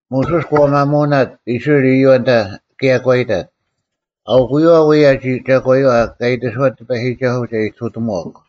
ᒧᓱᔅ ᒂ ᒪᒧᓇᑦ ᐃᔅᕋᐃᓪ ᐃᔪᐛ ᑭᔭ ᒂ ᐃᑕᑦ, “ᐊᐅᑯᔪᐛ ᐅᔭ ᒐᒂᔪᐛ ᑲ ᐃᑎᓱᐛᑦ ᑎᐸᔨᒋᒐᓱᐤ ᒐ ᐃᑐᑎᒺᒄ: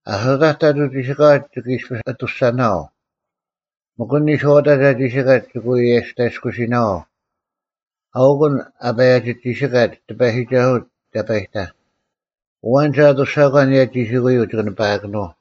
ᐊᓱᑕᒡ ᑕᑐᐤ ᒋᓯᑲᐛ ᒋᑭ ᐃᔅᐱᔅ ᐊᑐᔅᒐᓇᐛᐤ᙮ ᒥᒄ ᐊᓐ ᓂᔄᐅᑕᒡ ᐊ ᒋᓯᑲᒡ ᒋᑭ ᐎ ᐊᔭᔅᑕᔭᔅᑯᓯᓇᐛᐤ, ᐊᐅᑯᓐ ᐊ ᐸᔭᒋ ᒋᓴᑲᒡ ᑎᐸᔨᒋᒐᓱᐤ ᑕᐸᔨᑕᐧᒃ, ᐊᐛᓐ ᒐ ᐊᑐᔅᒐᒂ ᐊᓂᔭ ᒋᓯᑯᔪᐤ ᒋᑭ ᓂᐸᐊᑭᓄᐤ᙮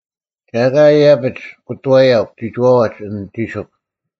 ᒐ ᐊᑲ ᐃᔭᐱᒡ ᑯᑐᐛᔭᒄ ᒋᒋᐛᐛᒡ ᐊᓐ ᒋᓯᒄ᙮”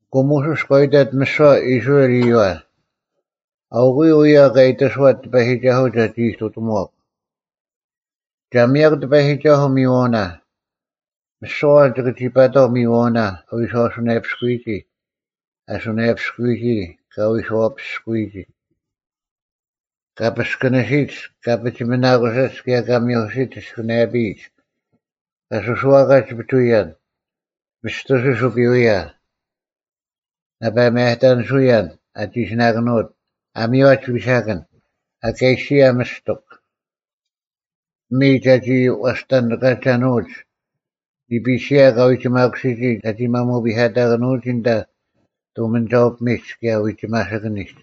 ᐊᑯ ᒧᓱᔅ ᑲ ᐃᑕᑦ ᒥᓯᐛ ᐃᔅᕋᐃᓪ ᐃᔪᐛ, “ᐊᐅᑯᔪᐤ ᐅᔭ ᑲ ᐃᑎᓱᐛᑦ ᑎᐸᔨᒋᒐᓱᐤ ᒐᒋ ᐃᑐᑎᒺᒄ: ᒐ ᒥᔭᒄ ᑎᐸᔨᒋᒐᓱᐤ ᒥᔨᐛᐅᓇ᙮ ᒥᓯᐛ ᐊᐛᓐ ᒋᑭ ᒋ ᐸᑕᐤ ᒥᔨᐛᐅᓇ ᐊ ᐎᔄᐅᓇᔭᐱᔅᑯᔨᒋ, ᐊ ᓱᓇᔭᐱᔅᑯᔨᒋ ᑭᔭ ᐊ ᐎᔄᐛᐱᔅᑯᔨᒋ; ᑲ ᐱᔅᑭᓂᓯᒡ, ᑲ ᐱᒋᒥᓇᑯᓯᒡ ᑭᔭ ᑲ ᒥᐧᑯᓯᒡ ᐊᓯᑭᓂᔭᐱᔨᒡ; ᑲ ᒥᔽᓯᒡ ᐱᒍᐎᔭᓐ; ᒥᔅᑐᓯᔅ ᐅᐱᐎᔭ; ᓇᐸ ᒪᔭᑕᓂᓱᔭᓐ ᐊ ᒋᓯᓇᑭᓄᐅᑦ; ᐊ ᒥᔽᒡ ᐱᓴᑭᓐ; ᐊᑲᓯᔭ ᒥᔅᑎᒄ; ᐱᒥᔾ ᒐᒋ ᐛᔅᑕᓂᑲᐛᒐᓄᐅᒡ; ᓂᐱᓯᔭ ᑲᐎᒋᒪᑯᓯᔨᒋ ᒐᒋ ᒪᒧᐱᑕᑭᓄᐅᒋ ᐊᓐᑕ ᑐᒥᓂᒐᐅ-ᐱᒥᒡ ᑭᔭ ᐎᒋᒪᓯᑭᓂᒡ;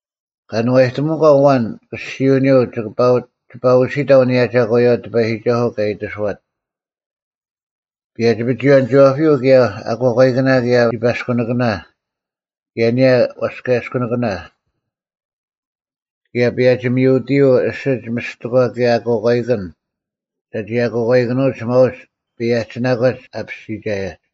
ᑲᓄᐛᔨᑎᒧᒂ ᐊᐛᓐ ᑭᔅᒋᐅᓂᔪᐤ ᒋᐸ ᐅᓯᑕᐤ ᐊᓂᔭ ᒐᒂᔪᐛ ᑎᐸᔨᒋᒐᓱᐤ ᑲ ᐃᑎᓱᐛᑦ᙮ ᐸᔭᒋ-ᐱᒍᐎᔭᓂᒋᐛᐱᔪᐤ ᑭᔭ ᐊᑯᐛᑲᐃᑭᓇ ᑭᔭ ᓯᐸᔅᑯᓂᑭᓇ, ᑭᔭ ᐊᓂᔭ ᐛᔅᑲᔭᔅᑯᓂᑭᓇ᙮ ᑭᔭ ᐸᔭᒋ-ᒥᐅᑎᔪᐤ ᐊᓯᒡ ᒥᔅᑎᒂ ᑭᔭ ᐊᑯᐛᑲᐃᑭᓐ ᒐᒋ ᐊᑯᐛᑲᐃᑭᓄᐅᒡ ᒪᐅᒡ ᐸᔭᒋᓇᒂᒡ ᑲᐱᔅᒋᒐᔭᒡ᙮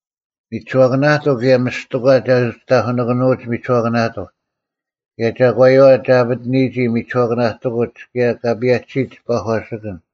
ᒥᒋᓱᐛᑭᓇᑎᒄ ᑭᔭ ᒥᔅᑎᒂ ᒐ ᐅᒋ ᑕᐧᑯᓇᑭᓄᐅᒡ ᒥᒋᓱᐛᑭᓇᑎᒄ ᑭᔭ ᒐᒂᔪᐛ ᒐ ᐊᐱᑎᓂᔨᒋ ᒥᒋᓱᐛᑭᓇᑎᑯᒡ ᑭᔭ ᑲ ᐸᔭᒋᓯᑦ ᐸᒂᓯᑭᓐ᙮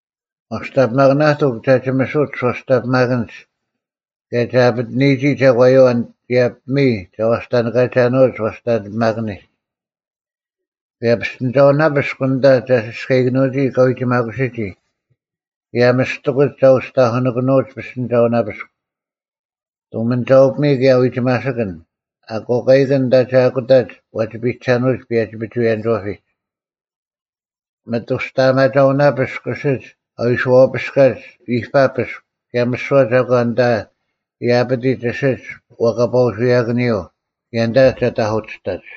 ᐛᔅᑕᓂᐱᒪᑭᓇᑎᒄ ᒐ ᒋᒥᓱᒡ ᐛᔅᑕᓂᐱᒪᑭᓐᒡ ᑭᔭ ᒐ ᐊᐱᑎᓂᔨᒋ ᒐᒂᔪᐛ ᑭᔭ ᐱᒥᔾ ᒐ ᐛᔅᑕᓂᑲᐛᒐᓄᐅᒡ ᐛᔅᑕᓂᐱᒪᑭᓂᒡ, ᑭᔭ ᐱᔅᑎᓂᒐᐅᓇᐱᔅᒄ ᐊᓐᑕ ᒐ ᓯᔅᑲᐃᑭᓂᔨᒋ ᑲᐎᒋᒪᑯᓯᔨᒋ ᑭᔭ ᒥᔅᑎᑯᒡ ᒐ ᐅᒋ ᑕᐧᑯᓂᑭᓄᐅᒡ ᐱᔅᑎᓂᒐᐅᓇᐱᔅᒄ᙮ ᑐᒥᓂᒐᐅ-ᐱᒥᔾ ᑭᔭ ᐎᒋᒪᓯᑭᓐ, ᐊᑯᐛᑲᐃᑭᓐ ᐊᓐᑕ ᒐ ᐊᑯᑕᒡ ᐛᒋ ᐱᔨᒐᓄᐅᒡ ᐸᔭᒋ-ᐱᒍᐎᔭᓂᒋᐛᐱᒡ᙮ ᒥᑐᔅᑕᐊᒪᒐᐅᓇᐱᔅᒄ ᐊᓯᒡ ᐊ ᐎᔄᐱᔅᑲᒡ ᐃᐸᐱᔅᒄ ᑭᔭ ᒥᓯᐛ ᒐᒂᓐ ᐊᓐᑕ ᐊ ᐃᑕᐱᑎᒡ ᐊᓯᒡ ᐛᐸᑲᐅᓱᔭᑭᓂᔪᐤ, ᑭᔭ ᐊᓐᑕ ᒐ ᑕᐧᑯᑎᔅᑕᒡ᙮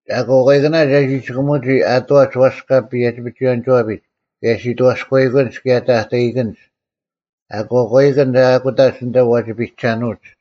ᐊᑯᐛᑲᐃᑭᓇ ᒐ ᒋᑭᒧᒋ ᐊᑐᐛᒡ ᐛᔅᑲ ᐸᔭᒋ-ᐱᒍᐎᔭᓂᒋᐛᐱᒡ ᑭᔭ ᓯᑥᔎᐃᑭᓐᒡ ᑭᔭ ᑕᑕᐃᑭᓐᒡ, ᐊᑯᐛᑲᐃᑭᓐ ᒐ ᐊᑯᑕᒡ ᐊᓐᑕ ᐛᒋ ᐱᒐᓄᐅᒡ᙮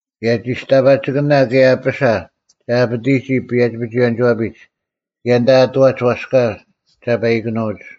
ᑭᔭ ᒋᔅᑕᐸᒋᑭᓇ ᑭᔭ ᐊᐱᓴ ᒐ ᐊᐱᑎᒋ ᐸᔭᒋ-ᐱᒍᐎᔭᓂᒥᒋᐛᐱᒡ ᑭᔭ ᐊᓐᑕ ᐊᑐᐛᒡ ᐛᔅᑲ ᒐᐸᐃᑭᓄᐅᒡ᙮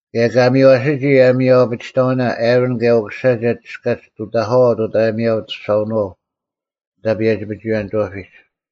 ᑭᔭ ᑲ ᒥᔽᓯᔨᒋ ᐊᔭᒥᐊᐅ-ᐊᐱᒋᑕᐅᓇ ᐊᕋᓐ ᑭᔭ ᐅᑯᓴ ᒐ ᒋᔅᑲᒡ ᑐᑕᐧᑲᐛ ᐅᑦ ᐊᔭᒥᐊᐅ-ᐊᑐᔅᒐᐅᓄᐛ ᐊᓐᑕ ᐸᔭᒋ-ᐱᒍᐎᔭᓂᒋᐛᐱᒡ᙮”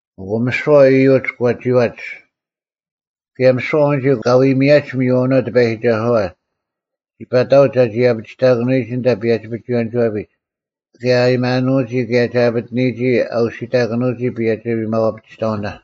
ᐊᑯ ᒥᓯᐛ ᐃᔪᒡ ᒂ ᒋᐛᒡ, ᑭᔭ ᒥᓯᐛ ᐊᐛᓐᒋ ᑲ ᐎ ᒥᔭᒡ ᒥᔨᐛᐅᓇ ᑎᐸᔨᒋᒐᓱᐛ, ᒋᐸᑕᐅᒡ ᒐᒋ ᐊᐱᒋᑕᑭᓄᐎᒋ ᐊᓐᑕ ᐸᔭᒋ-ᐱᒍᐎᔭᓂᒋᐛᐱᒡ ᑭᔭ ᐊᔭᒥᐊᓄᐎᒋ ᑭᔭ ᒐ ᐊᐱᑎᓂᔨᒋ ᐊ ᐅᓯᑕᑭᓂᐎᒋ ᐸᔭᒋ ᐊᔭᒥᐊᐅ-ᐊᐱᒋᑕᐅᓇ᙮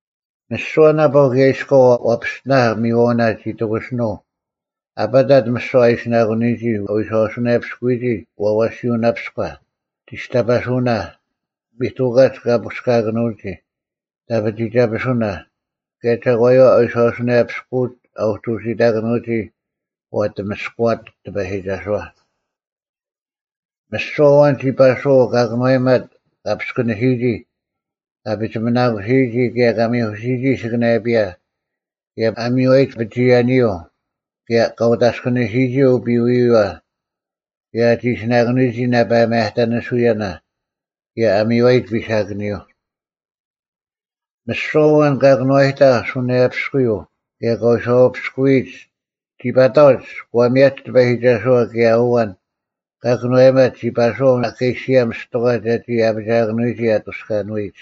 ᒥᓯᐛ ᓇᐸᐤ ᑭᔭ ᐃᔎᐤ ᐛ ᐱᔅᑎᓇᐧᒃ ᒥᔨᐛᐅᓇ ᒋ ᑎᑯᓯᓄᐤ ᐊᐸᑕᑦ ᒥᓯᐛ ᐊ ᐃᓯᓇᑯᓂᔨᒋ ᐊ ᐎᔄᐅᓱᓇᔭᐱᔅᑯᔨᒋ ᐛᐛᓯᐅᓇᐱᔎ, ᒋᔅᑕᐸᓱᓇ, ᒥᑐᑲᒡ ᑲ ᐳᔅᑲᑭᓄᐅᒋ, ᑕᐱᒋᒐᐱᓱᓇ, ᑭᔭ ᒐᒂᔪᐛ ᐎᔄᐅᓱᓇᔭᐱᔅᑯᒡ ᐊᐅᒡ ᐅᓯᑕᑭᓄᐎᒋ ᐛ ᐊᑎᒥᔅᑯᐛᑦ ᑎᐸᔨᒋᒐᓱᐛ᙮ ᒥᓯᐛ ᐊᐛᓐ ᒋ ᐸᓱᐛᐤ ᑲ ᑭᓄᐛᔨᒪᑦ ᑲ ᐱᔅᑯᓂᓯᔨᒋ, ᑲ ᐱᒋᒥᓇᑯᓯᔨᒋ ᑭᔭ ᑲ ᒥᐧᑯᓯᔨᒋ ᐊᓯᑭᓂᔭᐱᔭ ᑭᔭ ᐊ ᒥᔽᔨᒡ ᐱᒍᐎᔭᓂᔪᐤ ᑭᔭ ᑲ ᐅᑦ ᐊᔅᑭᓂᓯᔨᒋ ᐅᐱᐎᔪᐛ ᑭᔭ ᐊ ᒋᓯᓇᑭᓄᔨᒋ ᓇᐸ ᒪᔭᑕᓂᓱᔭᓇ ᑭᔭ ᐊ ᒥᔽᔨᒡ ᐱᓴᑭᓂᔪᐤ᙮ ᒥᓯᐛ ᐊᐛᓐ ᑲ ᑭᓄᐛᔨᑕᐧᒃ ᓱᓇᔭᐅᐱᔅᑯᔪᐤ ᑭᔭ ᑲ ᐎᔄᐛᐱᔅᑯᔨᒡ ᒋ ᐸᑕᐅᒡ ᒂ ᒥᔭᒡ ᑎᐸᔨᒋᒐᓱᐛ ᑭᔭ ᐊᐛᓐ ᑲ ᑭᓄᐛᔨᒪᑦ ᒋ ᐸᓱᐛᐤ ᐊᑲᓯᔭ ᒥᔅᑎᒂ ᒐᒋ ᐊᐱᒋᐊᑭᓄᐎᒋ ᐊᑐᔅᑲᓄᐎᒡ᙮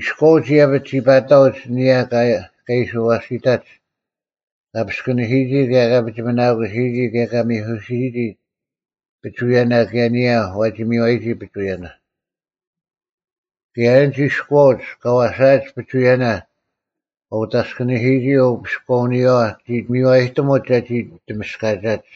ᐃᔎᐅᒡ ᐃᔭᐱᒡ ᒋ ᐸᑕᐅᒡ ᐊᓂᔭ ᑲ ᐃᓯ ᐛᓯᑕᒡ: ᑲ ᐱᔅᑭᓂᓯᔨᒋ ᑭᔭ ᑲ ᐱᒋᒥᓇᑯᓂᔨᒋ ᑭᔭ ᑲ ᒥᐧᑯᓯᔨᒋ ᐱᒍᐎᔭᓇ ᑭᔭ ᐊᓂᔭ ᐛᒋ ᒥᔽᓯᔨᒋ ᐱᒍᐎᔭᓇ᙮ ᑭᔭ ᐊᓐᒡ ᐃᔎᐅᒡ ᑲ ᐛᓴᐊᒡ ᐱᒍᐎᔭᓇ ᑲ ᐅᑦ ᐊᔅᑭᓂᓯᔨᒋ ᐅᐱᔅᑲᐅᓂᔪᐛ ᒋ ᒥᔽᔨᑎᒧᒡ ᒐᒋ ᑎᒥᔅᑲᒐᒡ᙮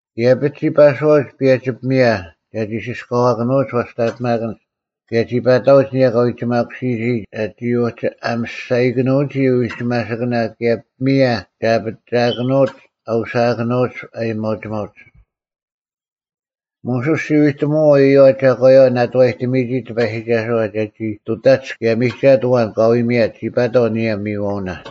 ᐃᔭᐱᒡ ᒋ ᐸᓱᐛᐅᒡ ᐸᔭᒋ ᐱᒥᔭ ᒐᒋ ᓯᔅᑲᐛᑭᓄᒡ ᐛᔅᑕᓂᐱᒪᑭᓐᒡ ᑭᔭ ᒋ ᐸᑕᐅᒡ ᐊᓂᔭ ᑲ ᐎᒋᒪᑯᓯᔨᒋ ᒐᒋ ᐅᒋ ᐊᒥᔅᒐᔨᑭᓄᐅᒋ ᐎᒋᒪᓯᑭᓇ ᑭᔭ ᐱᒥᔭ ᒐ ᐊᐱᒋᐊᑭᓄᒡ ᐊ ᐅᓯᐊᑭᓄᐅᒡ ᐊᔭᒥᐊᐅᒋᒪᐅᒡ᙮ ᒧᓱᔅ ᒋ ᐎᑎᒧᐛᐤ ᐃᔪᐛ ᒐᒂᔪᐛ ᓇᑐᐛᔨᑎᒥᔨᒋ ᑎᐸᔨᒋᒐᓱᐛ ᒐᒋ ᑐᑕᒡ ᑭᔭ ᒥᒐᑦ ᐊᐛᓐ ᑲ ᐎ ᒥᔭᑦ ᒋ ᐸᑕᐤ ᐊᓂᔭ ᐅᒥᔨᐛᐅᓇ᙮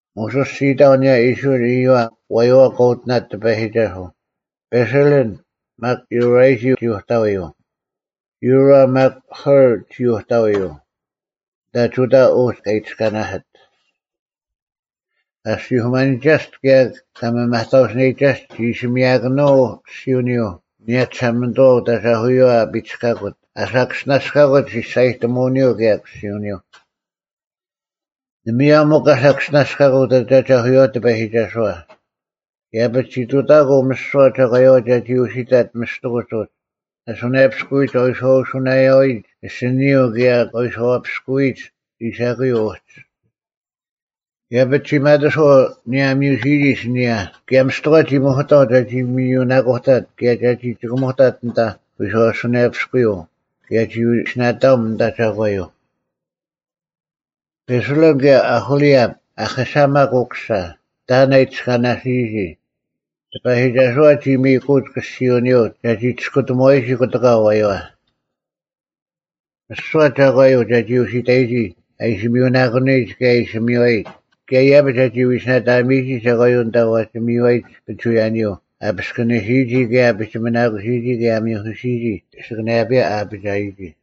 ᒧᓱᔅ ᒋ ᐃᑕᐤ ᐊᓂᔭ ᐃᔅᕋᐃᓪ ᐃᔪᐛ ᐊᐛᔪᐛ ᑲ ᐅᑎᓇᑦ ᑎᐸᔨᒋᒐᓱᐤ, ᐸᓴᓕᓪ, ᒪᒃ ᔪᕆᔨᒋ ᒋ ᐅᑕᐎᔪᐤ, ᔪᕆ ᒪᒃ ᐦᐅᕐ ᒋ ᐅᑕᐎᔪᐤ, ᐊᓐᑕ ᒍᑕ ᐅᒡ ᑲ ᐃᑎᔅᑲᓇᓯᑦ᙮ ᑲ ᐊᔅᒋᐧᑯᒪᓂᒐᔅᑦ ᑭᔭ ᑲ ᒥᒪᑕᐅᓯᓂᔨᒐᔅᑦ ᒋ ᐃᓯ ᒥᔭᑭᓄᐤ ᑭᔅᒋᐅᓂᔪᐤ ᐊᓂᔭ ᒋᓴᒪᓂᑐᐛ ᐅᑦ ᐊᒐᐧᑯᔪᐛ ᐊ ᐱᔅᑲᑯᑦ ᐊᓴᑭᔅᒋᓇᔅᑲᑯᑦ ᒋᔅᒐᔨᑎᒧᓂᔪᐤ ᑭᔭ ᑭᔅᒋᐅᓂᔪᐤ ᓇᒪᔭᔪᐤ ᒥᒄ ᑲ ᓴᑭᔅᒋᓇᔅᑲᑯᑦ ᐅᑦ ᐊᒐᐧᑯᔪᐛ ᑎᐸᔨᒋᒐᓱᐛ, ᐃᔭᐱᒡ ᒋ ᑐᑕᑯᐤ ᒥᓯᐛ ᒐᒂᔪᐛ ᒐᒋ ᐛᓯᑕᑦ ᒥᔅᑎᑯᒡ ᐅᒡ, ᐊ ᓱᓇᔭᐱᔅᑯᐎᒡ, ᐊ ᐎᔄᐅᓱᓇᔭᐎᒡ, ᐊᓯᓂᔪᐤ ᑭᔭ ᑲ ᐎᔄᐛᐱᔅᑯᐎᒡ ᐃᓴᑯᔪᐤ ᐅᒡ᙮ ᐃᔭᐱᒡ ᒋᒪᑎᔄᐤ ᐊᓂᔭ ᐊ ᒥᔪᓯᔨᒋ ᐊᓯᓂᔭ ᑭᔭ ᒥᔅᑎᒂ ᒋ ᒥᐧᑯᑕᐤ ᒐᒋ ᒥᔪᓇᑯᑕᑦ ᑭᔭ ᒐᒋ ᒋᑭᒧᑕᑦ ᐊᓐᑕ ᐎᔄᐅᓱᓇᔭᐱᔅᑯᔪᐤ ᑭᔭ ᒋ ᐎᓯᓇᑕᐊᒻ ᐊᓐᑕ ᒐᒂᔪᐤ᙮ ᐸᓴᓕᓪ ᑭᔭ ᐅᐦᐅᓕᐊᑉ, ᐊᐦᐃᓴᒪᒃ ᐅᑯᓴ, ᑕᐊᓐ ᐊ ᐃᑎᔅᑲᓇᓯᔨᒋ, ᑎᐸᔨᒋᒐᓱᐛ ᒋ ᒥᔨᑯᐅᒡ ᑭᔅᒋᐅᓂᔪᐤ ᒐᒋ ᒋᔅᑯᑎᒧᐛᔨᒋ ᑯᑎᑲ ᐊᐛᔪᐛ᙮ ᒥᓯᐛ ᒐᒂᔪᐤ ᒐᒋ ᐅᓯᑕᔨᒋ ᐊ ᐃᓯ ᒥᔪᓇᑯᓂᔨᒡ ᑭᔭ ᐊ ᐃᓯ ᒥᔽᔨᒡ ᑭᔭ ᐃᔭᐱᒡ ᒐᒋ ᐎᓯᓇᑕᒥᔨᒋ ᒐᒂᔪᐤ ᐊᓐᑕ ᐛᒋ ᒥᔽᓯᔨᒡ ᐱᒍᐎᔭᓂᔪᐤ ᐊ ᐱᔅᑭᓂᓯᔨᒋ ᑭᔭ ᐊ ᐱᒋᒥᓇᑯᓯᔨᒋ ᑭᔭ ᐊ ᒥᐧᑯᓯᔨᒋ ᐊᓯᑭᓂᔭᐱᔭ ᐊᐱᒋᐊᔨᒋ᙮